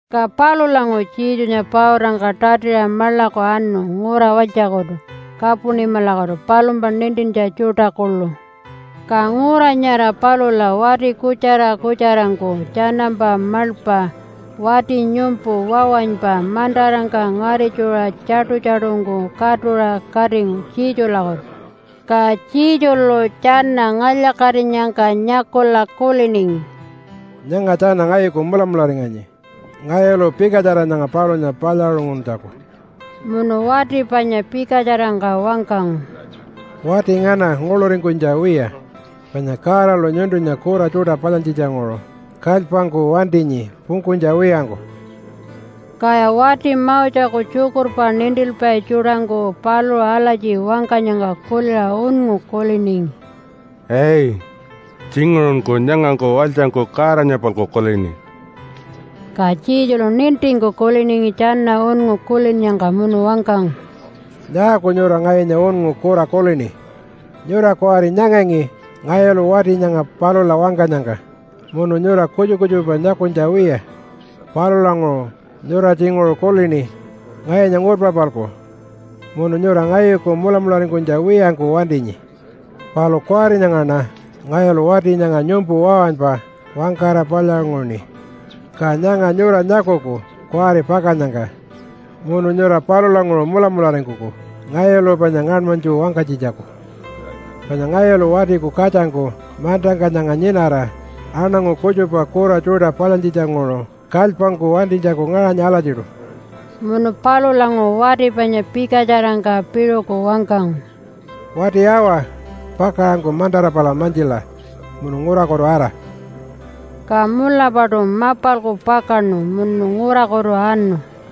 Ka palulanguṟu Jesunya pautangka tatiṟa maḻaku anu ngura walytjakutu Kapunimalakutu palumpa nintintja tjuṯa kuḻu. Ka ngura nyara palula wati kutjara kutjarangku tjanampa maḻpa wati nyumpu wawanypa mantarangka ngaritjuṟa tjaṯu-tjaṯungku katuṟa katingu Jesulakutu. Ka Jesulu tjana ngalya-katinyangka nyakula kuliningi, “Nyanga tjana ngayuku mulamularinganyi ngayulu pikatjara nyanga palunya palyaṟunguntjaku.” Munu wati panya pikatjarangka wangkangu, “Wati ngana, nguḻuringkunytja wiya! Panya Godalu nyuntunya kura tjuṯa palyantjitjanguṟu kalypangku wantinyi pungkunytja wiyangku.” Kaya wati Moseku tjukurpa nintilpai tjuṯangku paluṟu alatji wangkanyangka kuliṟa unngu kuliningi, “Ai! Tjinguṟunku nyangangku walytjangku Godanya-palku kulini.” Ka Jesulu nintingku kuliningi tjana unngu kulinnyangka munu wangkangu, “Nyaaku nyura ngayunya unngu kura kulini? Nyura kuwari nyangangi ngayulu wati nyanga palula wangkanyangka munu nyura kutjupa kutjupa nyakunytja wiya. Palulanguṟu nyura tjinguṟu kulini ngayunya ngurpa-palku, munu nyura ngayuku mulamularingkunytja wiyangku wantinyi. Palu kuwari nyangaṉa ngayulu wati nyanga nyumpu wawanypa wangkara palyaṟunguṉi. Ka nyanga nyura nyakuku kuwari pakannyangka munu nyura palulanguṟu mulamularingkuku ngayulu panya ngaṉmanytju wangkanytjitjaku, panya ngayulu Watiku Katjangku mantangka nyanga nyinara aṉangu kutjupa kura tjuṯa palyantjitjanguṟu kalypangku wantinytjaku ngaṟanyi alatjiṯu.” Munu palulanguṟu wati panya pikatjarangka piṟuku wangkangu, “Wati awa, pakaṟanku mantara pala mantjila munu ngurakutu ara!” Ka mulapaṯu mapalku pakaṉu munu ngurakutu anu.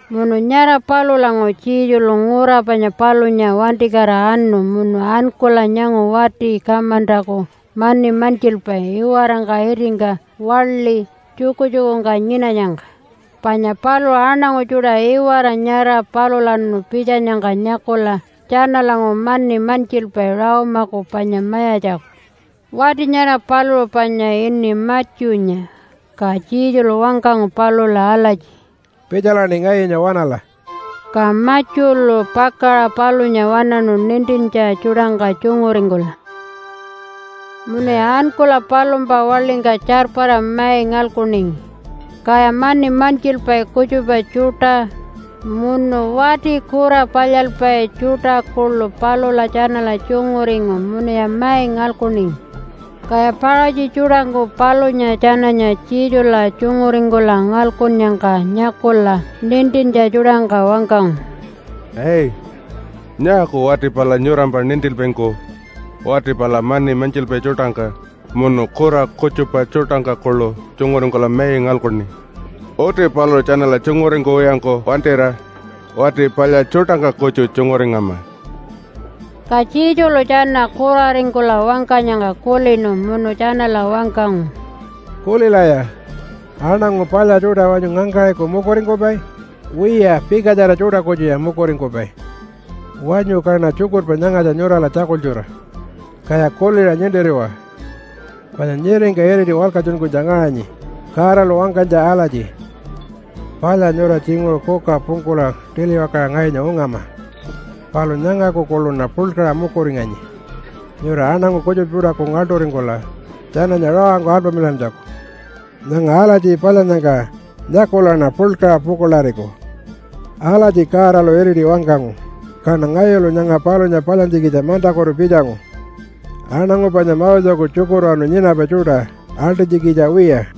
Munu nyara palulanguṟu Jesulu ngura panya palunya wantikatira anu munu ankula nyangu wati kamantaku mani mantjilpai iwarangka itingka waḻi tjukutjukungka nyinanyangka, panya paluṟu aṉangu tjuṯa iwara nyara palulawanu pitjanyangka nyakula tjanalanguṟu mani mantjilpai Rome-aku panya mayatjaku. Wati nyara paluṟu panya ini Matthew-nya, ka Jesulu wangkangu palula alatji, “Pitjalaṉi ngayunya waṉala!” Ka Matthew-lu pakaṟa palunya waṉaṉu nintintja tjuṯangka tjunguringkula. Munuya ankula palumpa waḻingka tjarpara mai ngalkuningi. Kaya mani mantjilpai kutjupa tjuṯa, munu wati kura palyalpai tjuṯa kuḻu palula tjanala tjunguringu munuya mai ngalkuningi, Kaya Paṟatji tjuṯangku palunya tjananya Jesula tjunguringkula ngalkunnyangka nyakula nintintja tjuṯangka wangkangu, “Ai! Nyaaku wati pala nyurampa nintilpaingku wati pala mani mantjilpai tjuṯangka munu kura kutjupa tjuṯangka kuḻu tjunguringkula mai ngalkuni? Uti paluṟu tjanala tjunguringkuwiyangku wantira wati palya tjuṯangka kutju tjunguringama.” Ka Jesulu tjana kuraringkula wangkanyangka kulinu munu tjanala wangkangu, “Kulilaya! Aṉangu palya tjuṯa wanyu ngangkaṟiku mukuringkupai? Wiya, pikatjara tjuṯa kutjuya mukuringkupai. Wanyu kaṉa tjukurpa nyangatja nyurala tjakultjura, kaya kuliṟa nintiriwa, panya nyiringka iriti walkatjunkunytja ngaṟanyi Godalu wangkanytja alatji, ‘Palya nyura tjinguṟu kuka pungkula tiliwakaṟa ngayunya ungama, palu nyangaku kuḻuṉa puḻkaṟa mukuringanyi nyura aṉangu kutjupa tjuṯaku ngaḻṯuringkula tjananya rawangku alpamilantjaku. Nyanga alatji palyannyangka nyakulaṉa puḻkaṟa pukuḻariku.’ Alatji Godalu iriti wangkangu, kaṉa ngayulu nyanga palunya palyantjikitja mantakutu pitjangu aṉangu panya Moseku tjukurwanu nyinapai tjuṯa aḻṯinytjikitja wiya,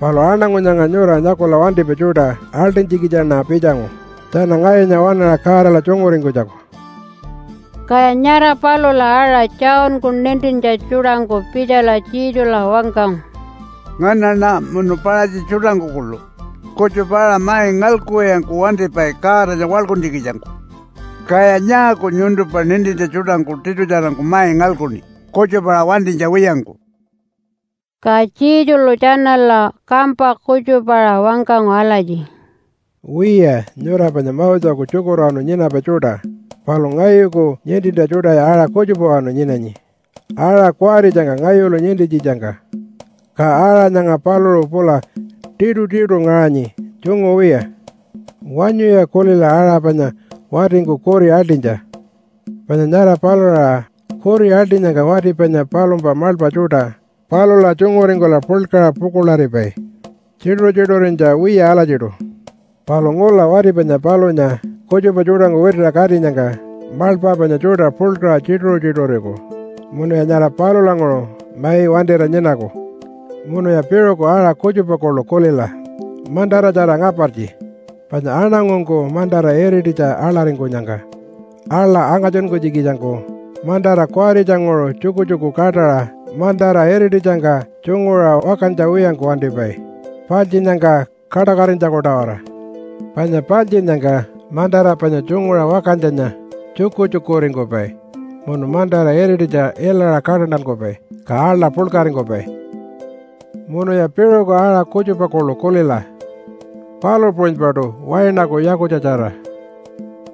palu aṉangu nyanga nyura nyakula wantipai tjuṯa aḻṯinytjikitjaṉa pitjangu tjana ngayunya waṉaṟa Godala tjunguringkunytjaku.” Kaya nyara palula aṟa Johnku nintintja tjuṯangku pitjala Jesula wangkangu, “Nganaṉa munu Paṟatji tjuṯangku kuḻu kutjupa-aṟa mai ngalkuwiyangku wantipai Godanya waḻkuntjikitjangku. Kaya nyaaku nyuntumpa nintintja tjuṯangku tiṯutjarangku mai ngalkuṉi kutjupa-aṟa wantinytja wiyangku?” Ka Jesulu tjanala kampa kutjupaṟa wangkangu alatji, “Wiya, nyura panya Moseku tjukurwanu nyinapai tjuṯa, palu ngayuku nintintja tjuṯaya aṟa kutjupawanu nyinanyi aṟa kuwaritjangka ngayulu nintintjitjangka, ka aṟa nyanga paluṟu pula tiṯutiṯu ngaṟanyi tjungu wiya. Wanyuya kulila aṟa panya watingku kuri aḻṯinytja, panya nyara palula aṟa kuri aḻṯinyangka wati panya palumpa maḻpa tjuṯa palula tjunguringkula puḻkaṟa pukuḻaripai, tjituṟu-tjituṟurinytja wiya alatjiṯu. Palu ngula wati panya palunya kutjupa tjuṯangku witiṟa katinyangka maḻpa panya tjuṯa puḻkaṟa tjituṟu-tjituṟuriku munuya nyara palulanguṟu mai wantira nyinaku. “Munuya piṟuku aṟa kutjupa kuḻu kulila mantaratjara ngapartji, panya aṉangungku mantara irititja aḻaringkunyangka aḻa angatjunkunytjikitjangku mantara kuwaritjanguṟu tjukutjuku kaṯaṟa mantara irititjangka tjunguṟa wakantja wiyangku wantipai paltjinnyangka kaṯakatinytjaku-tawara. Panya paltjinnyangka mantara panya tjunguṟa wakantjanya tjukutjukuringkupai munu mantara irititja ilaṟa kaṯantankupai, ka aḻa puḻkaringkupai. “Munuya piṟuku aṟa kutjupa kuḻu kulila palu puṟunypaṯu wainaku yakutjatjara.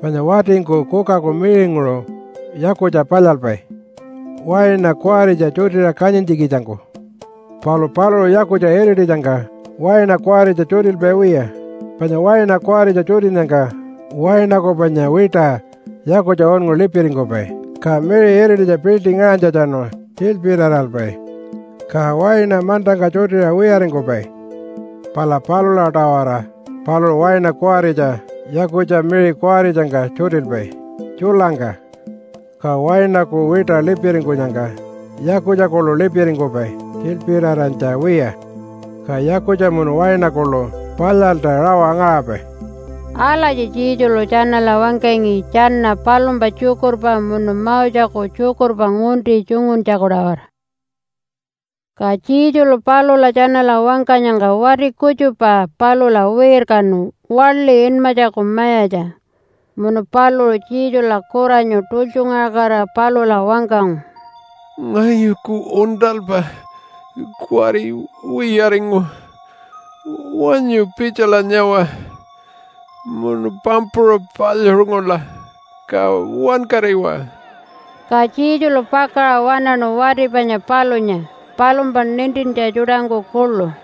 Panya watingku kukaku miṟinguṟu yakutja palyalpai waina kuwaritja tjutiṟa kanyintjikitjangku. Palu paluṟu yakutja irititjangka waina kuwaritja tjutilpai wiya, panya waina kuwaritja tjutinnyangka wainaku panya wiṯa yakutja unngu lipiringkupai, ka miṟi irititja piḻṯi ngaṟanytjatjanu tjilpiraralpai, ka waina mantangka tjutira wiyaringkupai. Pala palula-tawara paluṟu waina kuwaritja yakutja miṟi kuwaritjangka tjutilpai tjulangka, ka wainaku wiṯa lipiringkunyangka yakutja kuḻu lipiringkupai tjilpirarantja wiya, ka yakutja munu waina kuḻu palyalta rawa ngaṟapai.” Alatji Jesulu tjanala wangkangi tjana palumpa tjukurpa munu Moseku tjukurpa ngunti tjunguntjaku-tawara. Ka Jesulu palula tjanala wangkanyangka wati kutjupa palula wirkanu waḻi inmatjaku mayatja. Munu paluṟu Jesula kuranyu tultjungaṟakatira palula wangkangu, “Ngayuku uṉṯalpa kuwari wiyaringu. Wanyu pitjala nyawa, munu pampuṟa palyaṟungula ka wankariwa.” Ka Jesulu pakaṟa waṉaṉu wati panya palunya, palumpa nintintja tjuṯangku kuḻu.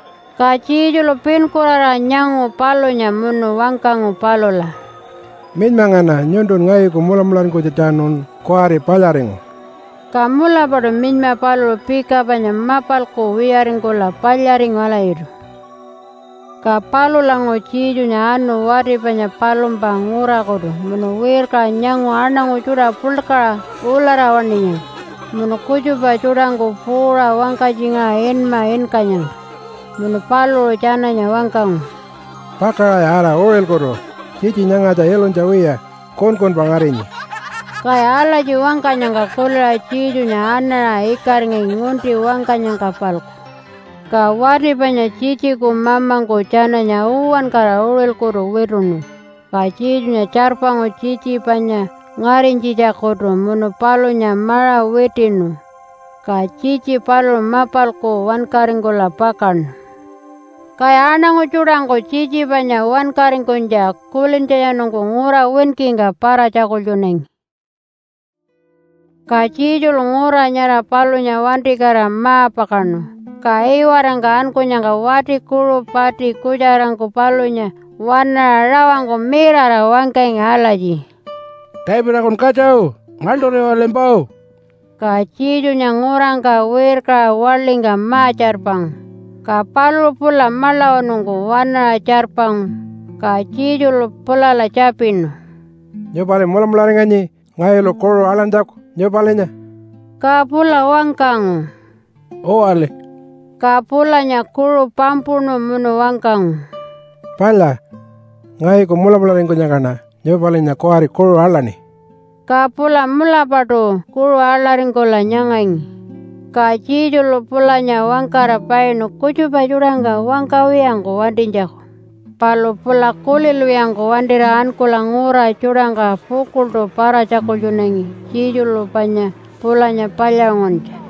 Ka Jesulu pinkuraraṟa nyangu palunya munu wangkangu palula, “Minyma ngana! Nyuntu ngayuku mulamularingkunytjatjanun kuwari palyaringu.” Ka mulapaṯu minyma paluṟu pika panya mapalku wiyaringkula palyaringu alatjiṯu. Ka palulanguṟu Jesunya anu wati panya palumpa ngurakutu munu wirkaṟa nyangu aṉangu tjuṯa puḻkaṟa ulara waṉinyangka munu kutjupa tjuṯangku puuṟa wangkatjingaṟa inma inkanyangka. Munu paluṟu tjananya wangkangu, “Pakaṟaya ara uṟilkutu! Tjitji nyangatja ilunytja wiya kunkunpa ngarinyi.” Kaya alatji wangkanyangka kuliṟa Jesunya anaṟa ikaringangi ngunti wangkanyangka-palku. Ka wati panya tjitjiku mamangku tjananya uwankara uṟilkutu wituṉu, ka Jesunya tjarpangu tjitji panya ngarinytjitjakutu munu palunya maṟa witiṉu, ka tjitji paluṟu mapalku wankaringkula pakaṉu. Kaya aṉangu tjuṯangku tjitji panya wankaringkunytja kulintjatjanungku ngura winkingka para-tjakultjunangi. Ka Jesulu ngura nyara palunya wantikatira ma-pakaṉu, ka iwarangka ankunyangka wati kuṟu pati kutjarangku palunya waṉaṟa rawangku mirara wangkangi alatji, “Davidakun katja! Ngaḻṯuriwalimpa!” Ka Jesunya ngurangka wirkaṟa waḻingka ma-tjarpangu, ka paluṟu pula maḻawanungku waṉaṟa tjarpangu, ka Jesulu pulala tjapinu, “Nyupali mulamularinganyi ngayulu kuṟu aḻantjaku nyupalinya?” Ka pula wangkangu, “Uwali.” Ka pulanya kuṟu pampuṉu munu wangkangu, “Palya, ngayuku mulamularingkunyangkaṉa nyupalinya kuwari kuṟu aḻaṉi.” Ka pula mulapaṯu kuṟu aḻaringkula nyangangi. Ka Jesulu pulanya wangkara painu kutjupa tjuṯangka wangkawiyangku wantinytjaku. Palu pula kulilwiyangku wantira ankula ngura tjuṯangka pukuḻṯu para-tjakultjunangi Jesulu panya pulanya palyaṟunguntja.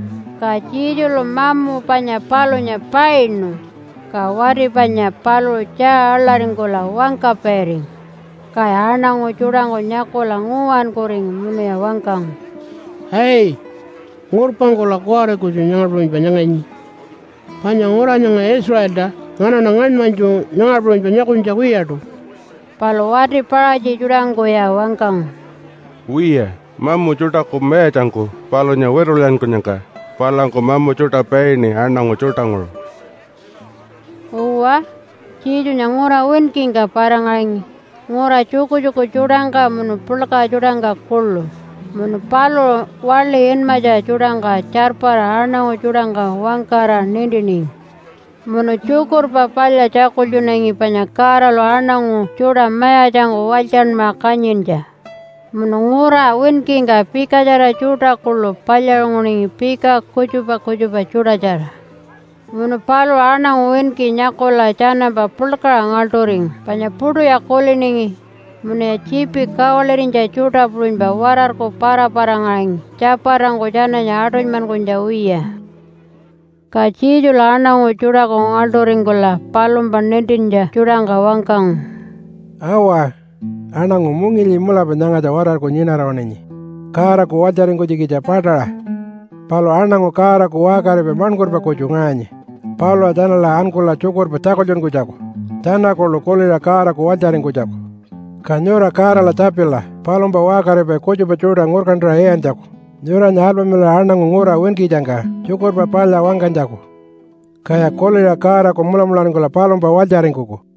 Ka Jesulu mamu panya palunya painu, ka wati panya paluṟu tjaa aḻaringkula wangkapairingu. Kaya aṉangu tjuṯangku nyakula nguwankuringu munuya wangkangu, “Ai! Ngurpangkula kuwari kutju nyanga puṟunypa nyanganyi, panya ngura nyanga Israelta nganaṉa ngaṉmanytju nyanga puṟunypa nyakunytja wiyaṯu.” Palu wati Paṟatji tjuṯangkuya wangkangu, “Wiya, mamu tjuṯaku mayatjangku palunya witulyankunyangka palangku mamu tjuṯa paini aṉangu tjuṯanguṟu.” Uwa, Jesunya ngura winkingka para-ngaṟangi ngura tjukutjuku tjuṯangka munu puḻka tjuṯangka kuḻu, munu paluṟu waḻi inmatja tjuṯangka tjarpara aṉangu tjuṯangka wangkara nintiningi, munu tjukurpa palya tjakultjunangi panya Godalu aṉangu tjuṯa mayatjangku walytjanmaṟa kanyintja. Munu ngura winkingka pikatjara tjuṯa kuḻu palyaṟunguningi pika kutjupa kutjupa tjuṯatjara. Munu paluṟu aṉangu winki nyakula tjanampa puḻkaṟa ngaḻṯuringu, panya puṯuya kuliningi munuya tjiipi kawalirinytja tjuṯa puṟunypa watarku para-para-ngaṟangi tjapatangku tjananya aṯunymankunytja wiya. Ka Jesulu aṉangu tjuṯaku ngaḻṯuringkula palumpa nintintja tjuṯangka wangkangu, “Awa! Aṉangu mungilyi mulapa nyangatja watarku nyinara-waṉinyi Godaku walytjaringkunytjikitja paṯaṟa, palu aṉangu Godaku waṟkaripai maṉkurpa kutju ngaṟanyi palula tjanala ankula tjukurpa tjakultjunkunytjaku tjana kuḻu kuliṟa Godaku walytjaringkunytjaku. Ka nyura Godala tjapila palumpa waṟkaripai kutjupa tjuṯa ngurkantaṟa iyantjaku nyuranya alpamilaṟa aṉangu ngura winkitjangka Tjukurpa Palya wangkanytjaku. Kaya kuliṟa Godaku mulamularingkula palumpa walytjaringkuku.”